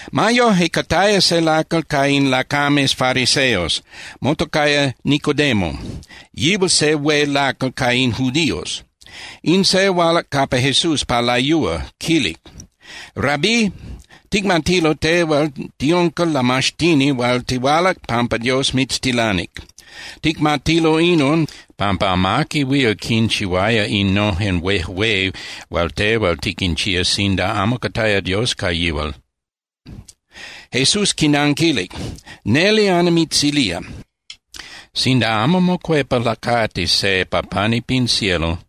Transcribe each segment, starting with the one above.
Ma yoje, cataya se lacal ca in lacames fariseos, motocaya Nicodemo. Yihual se hué lacal ca in judíos. In se hualac capa Jesús pa layúa, quilic: —Rabí, ticmatilo tehual tiunca lamaxtini hual tihualac pampa Dios mitztilanic. Ticmatilo inon, pampa amaqui huil quinchihuaya innojen huejué hual tehual tiquinchía sinda amo cataya Dios ca yihual. Jesús quinanquilic: —Neli nimitzilía, sinda amo mocuepa lacati se pa pani pin cielo,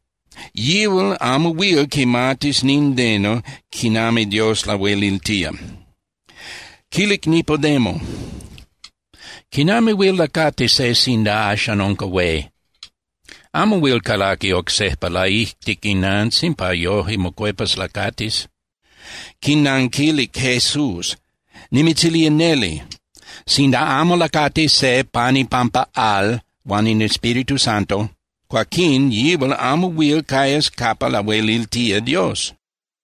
yihual amo huil quimatis nindeno quinami Dios lahueliltía. Quilic Nicodemo: —¿Quinami huil lacati se sinda axan unca hué? Amo huil calaqui oc sejpa laijtic inantzin pa yoje mocuepas lacatis. Quinanquilic Jesús: —Nimitzilía neli, sinda amo lacati se pan ipampa al huan in Espíritu Santo, cuaquín yihual amo huil cayas capa lahueliltía Dios.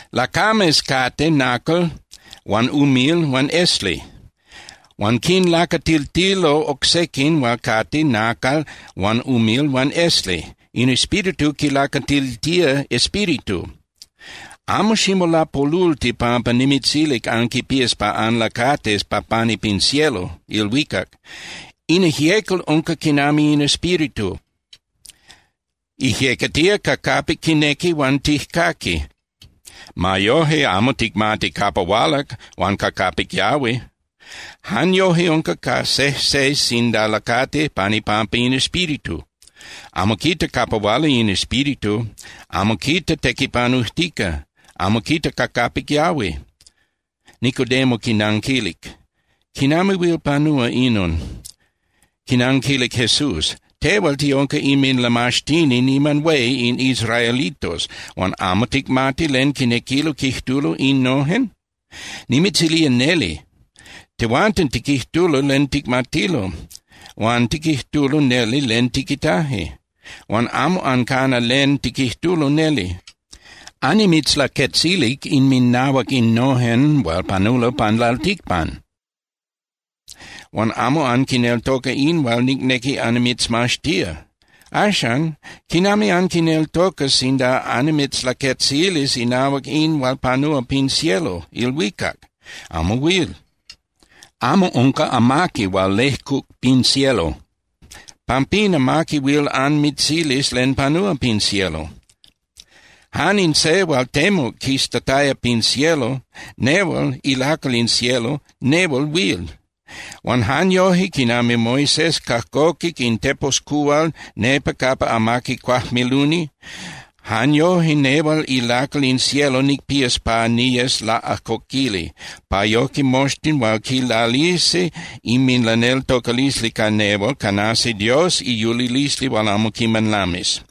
Lacames cate nacal huan umil huan esli. Huan quinlacatiltilo oc sequin hual cate nacal huan umil huan esli. In Espíritu quilacatiltía espíritu. Amo ximolapolulti pampa nimitzilic anquipías pa anlacatis pa pani pin cielo (ilhuicac). In ijyecal unca quinami in Espíritu, ijyecatía ca capic quinequi huan tijcaqui. Ma yoje, amo ticmati capa hualac huan ca capic yahui. Jan yoje unca ca sejse sinda lacati pan ipampa in Espíritu. Amo quita capa huala in Espíritu, amo quita tequipanujtica, amo quita ca capic yahui. Nicodemo quinanquilic: —¿Quinami huil panúa inon? Quinanquilic Jesús: —Tehual tiunca inminlamaxtini niman hué in israelitos, huan ¿amo ticmati len quinequilo quijtulo innojen? Nimitzilía neli, tehuanten tiquijtulo len ticmatilo, huan tiquijtulo neli len tiquitaje. Huan amo ancana len tiquijtulo neli. Annimitzlaquetzilic inminahuac innojen hual panulo pan lalticpan. Huan amo anquineltoca in hual nicnequi annimitzmaxtía. Axan, ¿quinami anquineltocas sinda annimitzlaquetzilis inahuac in hual panúa pin cielo (ilhuicac)? Amo huil. ’Amo unca amaqui hual lejcuc pin cielo. Pampín amaqui huil anmitzilis len panúa pin cielo. Jan in Se hual temuc quistataya pin cielo, nehual ilacal in cielo, nehual huil. Huan jan yoje quinami Moisés cajcoquic in teposcuhual nepa capa amaqui cuajmiluni, jan yoje nehual ilacal in cielo nicpías pa niyes laꞌajcoquili, pa yoje moxtin hual quilalisi inminlaneltocalisli ca nehual canasi Dios iyulilisli hual amo quiman lamis.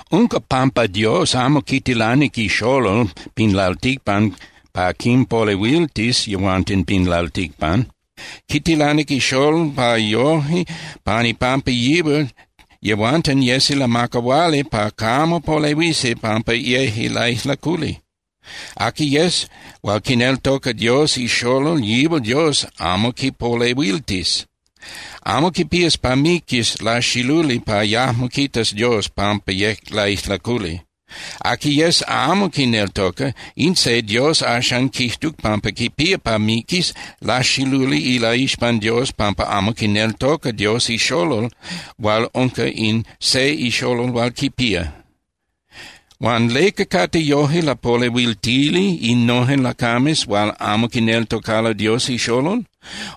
Unca pampa Dios amo quitilanic iXolol pin lalticpan pa quinpolehuiltis yehuanten pin lalticpan. Quitilanic iXolol pa yoje pan ipampa yihual yehuanten yesi lamacahuali pa camo polehuisi pampa yeje laijlaculi. Aqui yes hual quineltoca Dios iXolol yihual Dios amo quipolehuiltis. Amo quipías pa miquis laxiluli pa yajmo quitas Dios pampa yec laijlaculi. Aqui yes amo quineltoca, in se Dios axan quijtuc pampa quipía pa miquis laxiluli ilaixpan Dios pampa amo quineltoca Dios iXolol hual unca in se iXolol hual quipía. Huan ¿leca cate yoje lapolehuiltili innojen lacames hual amo quineltocalo Dios iXolol?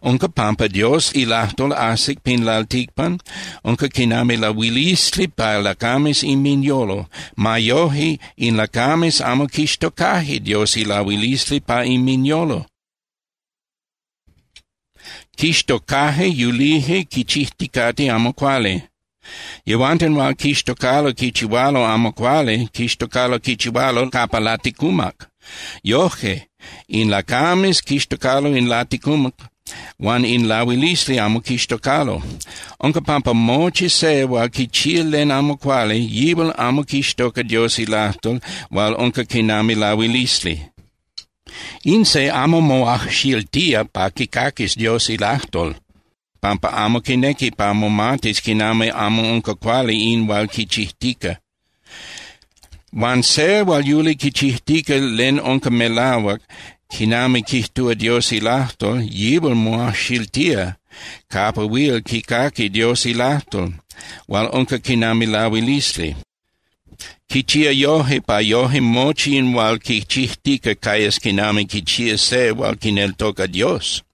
Unca pampa Dios ilajtol ajsic pin lalticpan, unca quinami lahuilisli pa lacames inminyolo. Ma yoje, in lacames amo quixtocaje Dios ilahuilisli pa inminyolo. Quixtocaje yulije quichijticate amo cuali. Yehuanten hual quixtocalo quichihualo amo cuali quixtocalo quichihualo capa laticumac. Yoje, in lacames quixtocalo in laticumac huan in lahuilisli amo quixtocalo. Unca pampa mochi se hual quichía len amo cuali, yihual amo quixtoca Dios ilajtol hual unca quinami lahuilisli. In se amo moajxiltía pa quicaquis Dios ilajtol, pampa amo quinequi pa momatis quinami amo unca cuali in hual quichijtica. Huan se hual yuli quichijtica len unca melahuac quinami quijtúa Dios ilajtol, yihual moajxiltía capa huil quicaqui Dios ilajtol hual unca quinami lahuilisli. Quichía yoje pa yoje mochi in hual quichijtica cayas quinami quichía se hual quineltoca Dios.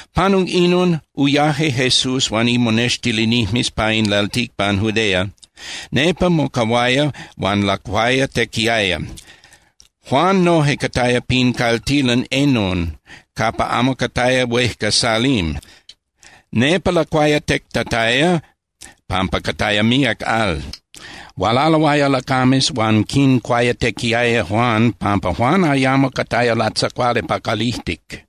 Panuc inon, uyaje Jesús huan imonextilinijmes pa in lalticpan Judea, nepa mocahuaya huan lacuayatequiaya. Juan noje cataya pin caltilan Enon capa amo cataya huejca Salim. Nepa lacuayatectataya pampa cataya míac al. Hualaloaya lacames huan quincuayatequiaya Juan pampa Juan ayamo cataya latzacuali pa calijtic.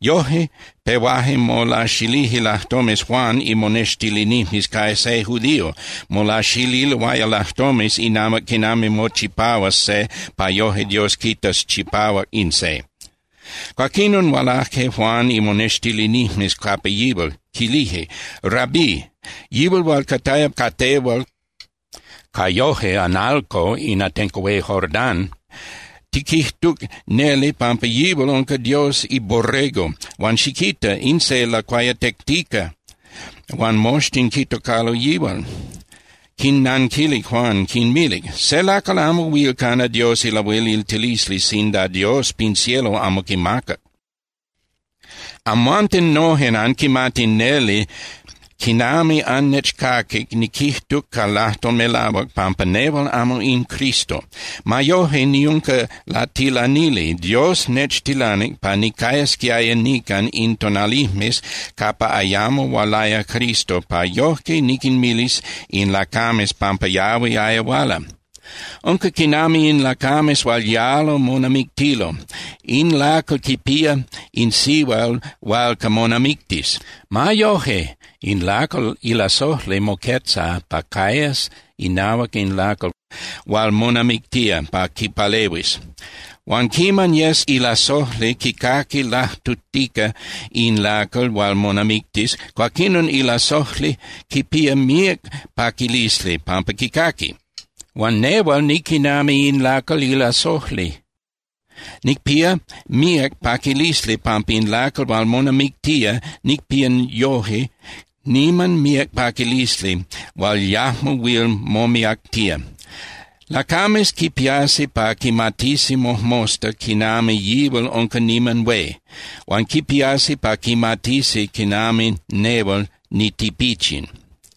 Yoje, pehuaje molaxilije lajtomes Juan imonextilinijmes ca se judío, molaxililoaya lajtomes inahuac quinami mochipahuas se pa yoje Dios quitas chipahuac in se. Cuaquinon hualaje Juan imonextilinijmes capa yihual, quilije: —Rabí, yihual hual cataya ca tehual ca yoje (analco) in atenco hué Jordán, tiquijtuc neli pampa yihual unca Dios iBorrego, huan xiquita. In se lacuayatectica huan moxtin quitocalo yihual. Quinnanquilic Juan, quinmilic: —Se lacal amo huil cana Dios ilahueliltilisli sinda Dios pin cielo amo quimacac. Amhuanten nojen anquimati neli quinami annechcaquic niquijtuc ca lajtol melahuac pampa nehual amo in Cristo. Ma yoje, niunca latilanili, Dios nechtilanic pa nicayasquiaya nican in tonalijmes capa ayamo hualaya Cristo pa yoje niquinmilis in lacames pampa yahuiaya huala. Unca quinami in lacames hual yalo monamictilo. In lacal quipía in sihual hualca monamictis. Ma yoje, in lacal ilasojli moquetza pa cayas inahuac in lacal hual monamictía pa quipalehuis. Huan quiman yes ilasojli quicaqui lajtujtica in lacal hual monamictis, cuaquinon ilasojli quipía míac paquilisli pampa quicaqui. Huan nehual niquinami in lacal ilasojli. Nicpía míac paquilisli pampa in lacal hual monamictía, nicpía yoje niman míac paquilisli hual yajmo huil momiactía. Lacames quipiasi pa quimatisi mojmosta quinami yihual unca niman hué. Huan quipiasi pa quimatisi quinami nehual nitipichin.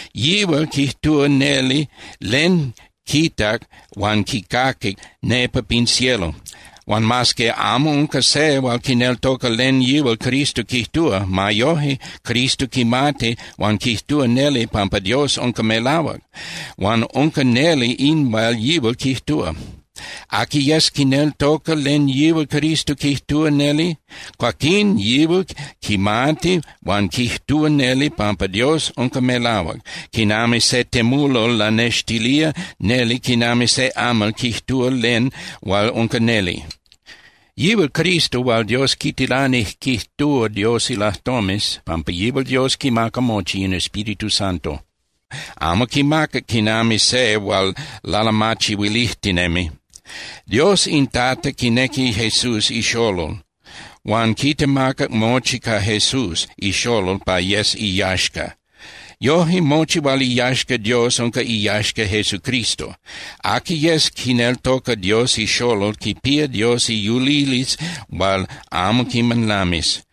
Yihual quijtúa neli len quitac huan quicaquic nepa pin cielo. Huan mas que amo unca se hual quineltoca len yihual Cristo quijtúa, ma yoje Cristo quimati huan quijtúa neli pampa Dios unca melahuac, huan unca neli in hual yihual quijtúa. Aqui yes quineltoca len yihual Cristo quijtúa neli, cuaquín yihual quimati huan quijtúa neli pampa Dios unca melahuac, quinami se temulol lanextilía neli quinami se amal quijtúa len hual unca neli. Yihual Cristo hual Dios quitilanic quijtúa Dios ilajtomes, pampa yihual Dios quimaca mochi in Espíritu Santo. Amo quimaca quinami se hual lalamachihuilijtinemi. Dios in Tata quinequi Jesús iXolol, huan quitemacac mochi ca Jesús iXolol pa yes iyaxca. Yoje mochi hual iyaxca Dios unca iyaxca Jesucristo. Aqui yes quineltoca Dios iXolol quipía Dios iyulilisli hual amo quiman lamis.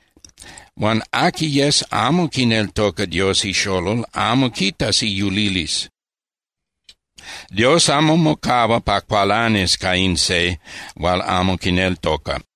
Huan aqui yes amo quineltoca Dios iXolol amo quitas iyulilisli. Dios amo mocahua pa cualanis ca in se hual amo quineltoca.